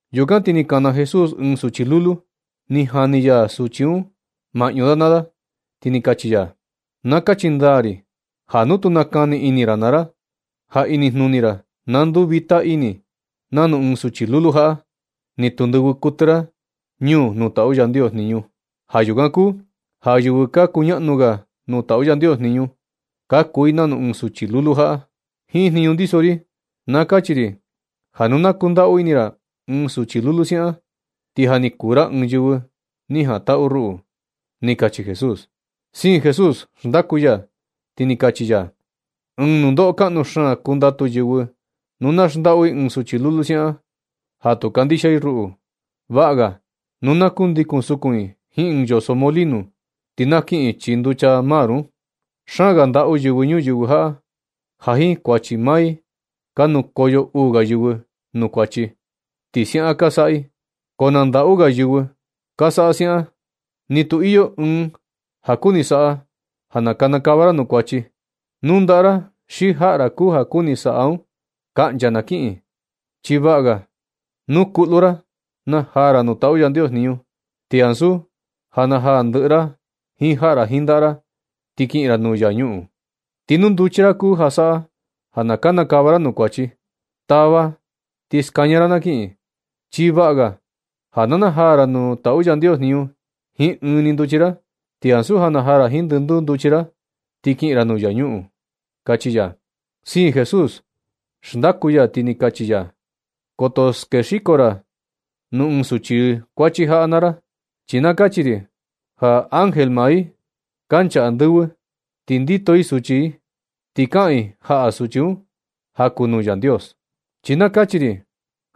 Yukan ti ni kana Jesús ɨɨn suchi lulu, ni jani ya suchi un maꞌñu da naa da, ti ni kachi ya: ―Na kachi ndaa ri ja nu tu nakani ini ra naa ra, ja inijnuni ra na nduu vita ini ra nanu ɨɨn suchi lulu jaꞌa, ni tu ndɨvɨ kuɨtɨ ra ñuu nuu taꞌu Yandios jniñu. Ja yukan kuu ja yɨvɨ ka kuñaꞌnu ga nuu taꞌu Yandios jniñu, ka kuu i nanu ɨɨn suchi lulu jaꞌa. Jiin jniñu ndiso ri na kachi ri ja nu na kundaꞌu ini ra ɨɨn suchi lulu siaꞌan, ti ja ni kuu ra ɨɨn yɨvɨ ni jantaꞌu ruꞌu ―ni kachi Jesús. Siin Jesús ndaku ya, ti ni kachi ya: ―Ɨɨn nundoꞌo kaꞌnu xaan kundatu yɨvɨ nu na xndaꞌu i ɨɨn suchi lulu siaꞌan, ja tu kandixia i ruꞌu. Vaꞌa ga nu na kundikun sukun i jiin ɨɨn yoso molino, ti na kiꞌin i chii nducha lago un. Xaan ga ndaꞌu yɨvɨ ñuyɨvɨ jaꞌa ja jiin kuachi maa i ka nukoyo uu ga yɨvɨ nuu kuachi. Ti siaꞌan ka saꞌa i, ko na ndaꞌu ga yɨvɨ ka saꞌa siaꞌan. Ti nu iyo ɨɨn ja kuni saꞌa ja na kanakava ra nuu kuachi, nu ndaꞌa ra xi jaꞌa ra kuu ja kuni saꞌa un, kaꞌncha na kiꞌin. Chi vaꞌa ga nu kuꞌlu ra na najaa ra nuu taꞌu Yandios jniñu, ti ansu ja na najaa ndɨꞌɨ ra jiin jaꞌa ra jiin ndaꞌa ra, ti kiꞌin ra nuu infiernu. Ti nu nduchi ra kuu ja saꞌa ja na kanakava ra nuu kuachi, tava ti skaña ra na kiꞌin. Chi vaꞌa ga ja na najaa ra nuu taꞌu Yandios jniñu jiin ɨɨn ni nduchi ra, ti ansu ja najaa ra jiin ndɨnduu nduchi ra, ti kiꞌin ra nuu infiernu ―kachi ya. Siin Jesús xndaku ya, ti ni kachi ya: ―Koto skexiko ra nuu ɨɨn ɨɨn suchi kuachi jaꞌa naa ra. Chi na kachi ri ja ángel maa i, kancha andɨvɨ ti ndito i suchi, ti kaꞌan i jaꞌa suchi un ja kuu nuu Yandios. Chi na kachi ri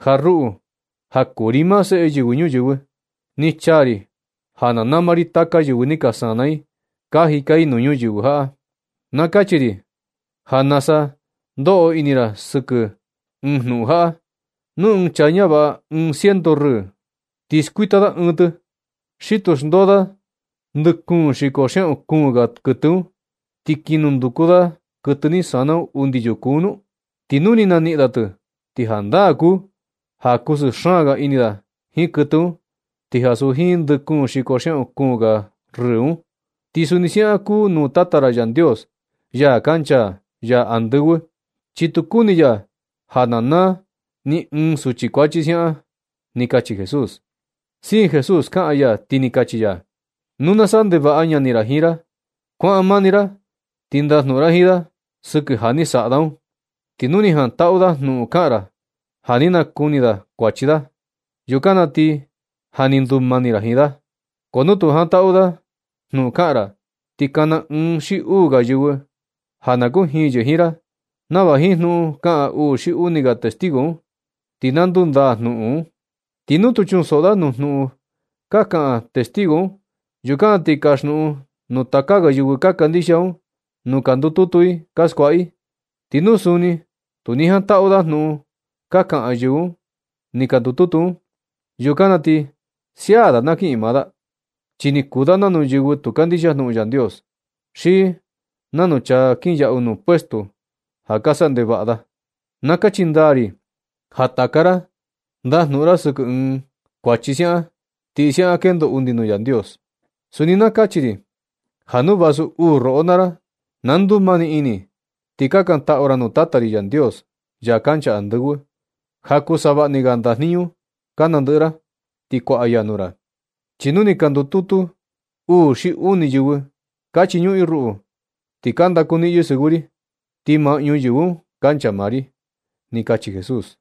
ja ruꞌu, ja kuu ri maa Seꞌe Yɨvɨ Ñuyɨvɨ, ni chaa ri ja na nama ri taka yɨvɨ ni ka sana i ka jika i nuu ñuyɨvɨ jaꞌa. Na kachi ri ja nasa ka ndoꞌo ini ra sɨkɨ ɨɨn jnuꞌun jaꞌa. Nu ɨɨn chaa ñavaꞌa ɨɨn ciento rɨɨ, ti skuita da ɨɨn tɨ. ¿Xi tu xndoo da ndɨꞌɨ kuun xiko xiaꞌan kuun ga kɨtɨ un, ti kiꞌin nunduku da kɨtɨ ni sana un undi yuku un nu? Ti nu ni naniꞌin da tɨ, ti jandaa kuu ja kusɨɨ xaan ga ini da jiin kɨtɨ un, ti ansu jiin ndɨ kuun xiko xiaꞌun kuun ga rɨɨ un. Ti suni siaꞌan kuu nuu Tata ra Yandios ja kancha ya andɨvɨ, chi tu kuni ya ja na naa ni ɨɨn suchi kuachi siaꞌan ―ni kachi Jesús. Siin Jesús kaꞌan ya, ti ni kachi ya: ―Nu na saꞌa ndevaꞌa ñani ra jiin ra, kuaꞌan maa ni ra ti ndajnuꞌun ra jiin da sɨkɨ ja ni saꞌa da un. Ti nu ni jantaꞌu da jnuꞌun kaꞌan ra ja ni nakuni da falta da, yukan na ti ja ni ndumani ra jiin da. Ko nu tu jantaꞌu da jnuꞌun kaꞌan ra, ti kana ɨɨn xi uu ga yɨvɨ ja na kujiin yɨ jiin ra, nava jiin jnuꞌun kaꞌan uu xi uni ga testigo un, ti na ndundaa jnuꞌun un. Ti nu tu chuꞌun soꞌo da nuu jnuꞌun ka kaꞌan testigo un, yukan na ti kasjnuꞌun nuu taka ga yɨvɨ ka kandixia un nu ka ndututu i ka skuaꞌa i. Ti nu suni tu ni jantaꞌu da jnuꞌun ka kaꞌan yɨvɨ ni ka ndututu un, yukan na ti sia da na kiꞌin maa da, chi ni kuu da nanu yɨvɨ tu kandixia jnuꞌun Yandios, xi nanu chaa kinyaꞌu nuu puestuo ja ka sa ndevaꞌa da. Na kachi ndaa ri ja taka ra ndajnuꞌun ra sɨkɨ ɨɨn falta siaꞌan, ti siaꞌan kendo undi nuu Yandios. Suni na kachi ri ja nu vasu uu roꞌo naa ra na ndumani ini, ti kakantaꞌu ra nuu Tata ri Yandios, ya kancha andɨvɨ, ja kuu savaꞌa ni ga ndajniñu ka nandɨꞌɨ ra, ti kuaꞌa ya nuu ra. Chi nu ni ka ndututu uu xi uni yɨvɨ ka chiñuꞌun i ruꞌu, ti ka ndakuniꞌin yɨ sɨvɨ ri, ti maꞌñu yɨvɨ un kancha maa ri ―ni kachi Jesús.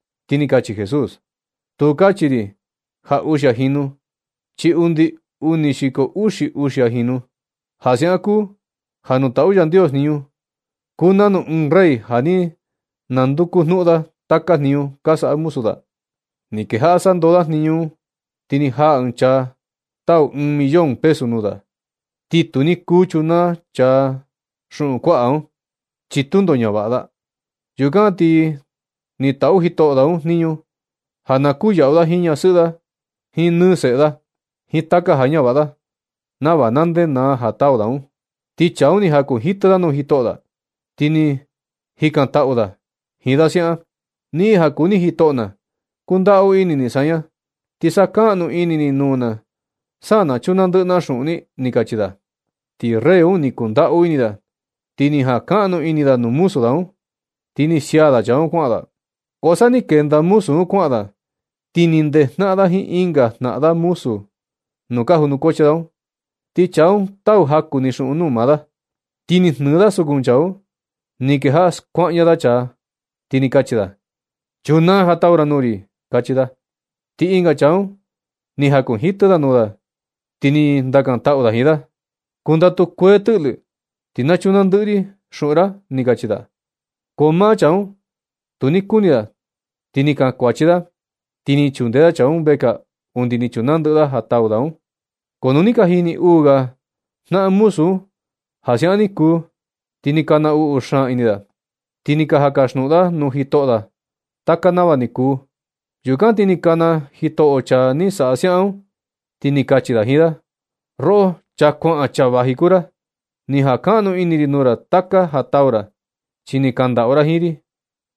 Ti ni kachi Jesús: ―Tu kachi ri ja uxia jinu, chi undi uni xiko uxi uxia jinu. Ja siaꞌan kuu ja nuu taꞌu Yandios jniñu kuu nanu ɨɨn rey ja ni nanduku jnuꞌun da taka jniñu ka saꞌa muzu da. Ni kejaꞌa sandoo da jniñu un. Ti ni jaa ɨɨn chaa tau ɨɨn millón pesu nuu da. Ti tu ni kuu chunaa chaa un xuꞌun kuaꞌa un, chi tundo ñavaꞌa da. Yukan ti ni taꞌu jitoꞌo da un jniñu ja na kuyaꞌu da jiin ñasɨꞌɨ da nɨɨ jiin seꞌe da, jiin taka ja ñavaꞌa da, nava na ndenaa ja tau da un. Ti chaa un ni jakunjitɨ da nuu jitoꞌo da, ti ni kaꞌan ndaꞌu da jiin da siaꞌan: “Niꞌin ja kuu ni jitoꞌo na, kundaꞌu ini ni saña, ti sakaꞌnu ini ni nuu na sa na chunaa ndɨꞌɨ na xuꞌun ni”, ni kachi da. Ti rey un ni kundaꞌu ini da, ti ni jankaꞌnu ini nuu muzu da un, ti ni sia da chaa un kuaꞌan da. Ko sa ni kenda muzu un kuaꞌan da, ti ni ndejnaꞌan da jiin ɨnga jnaꞌan muzu da nuu ka junukuachi da un, ti chaa un tau jaku ni xuꞌun nuu maa da. Ti ni jnɨɨ da sukun chaa un, ni kejaꞌa skuaꞌña da chaa, ti ni kachi da: “¡Chunaa ja tau ra nuu ri”! ―kachi da. Ti ɨnga chaa un ni jakunjitɨ da nuu da, ti ni kaꞌan ndaꞌu da jiin da: “Kundatu kuee tɨꞌlɨ, ti na chunaa ndɨꞌɨ ri xuꞌun ra”, ni kachi da. Ko maa chaa un tu ni kuni da. Ti ni kankuachi da, ti ni chunde da chaa un vekaa undi ni chunaa ndɨꞌɨ da ja tau da un. Ko nu ni ka jini uu ga jnaꞌan muzu un ja siaꞌan ni kuu, ti ni ka naꞌnu xaan ini da, ti ni ka jaꞌan ka kasjnuꞌun da nuu jitoꞌo da taka nava ni kuu. Yukan ti ni kana jitoꞌo un chaa ni saꞌa siaꞌan un, ti ni kachi da jiin da: “Roꞌo, chaa ka kuaꞌan ka vaji kuu ra. Ni jankaꞌnu ini ri nuu ra taka ja tau ra, chi ni kandaꞌu ra jiin ri.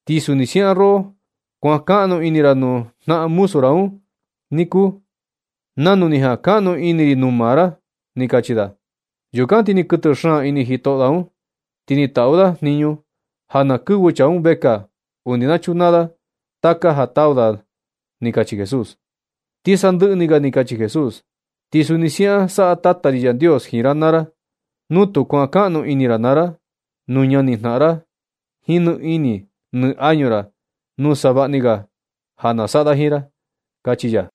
Ti suni siaꞌan roꞌo kuankaꞌnu ini ra nuu jnaꞌan muzu ra un ni kuu, nanu ni jankaꞌnu ini ri nuu maa ra”, ni kachi da. Yukan ti ni kɨtɨ xaan ini jitoꞌo da un, ti ni taꞌu da jniñu ja na kɨvɨ chaa un vekaa undi na chunaa da taka ja tau da un ―ni kachi Jesús. Ti sandɨꞌɨ ni ga ni kachi Jesús: ―Ti suni siaꞌan saꞌa Tata ri Yandios jiin ra naa ra nu tu kuankaꞌnu ini ra naa ra nuu ñanijnaꞌan ra jiin ni ini ni añu ra, nu savaꞌa ni ga ja na saꞌa da jiin ra ―kachi ya.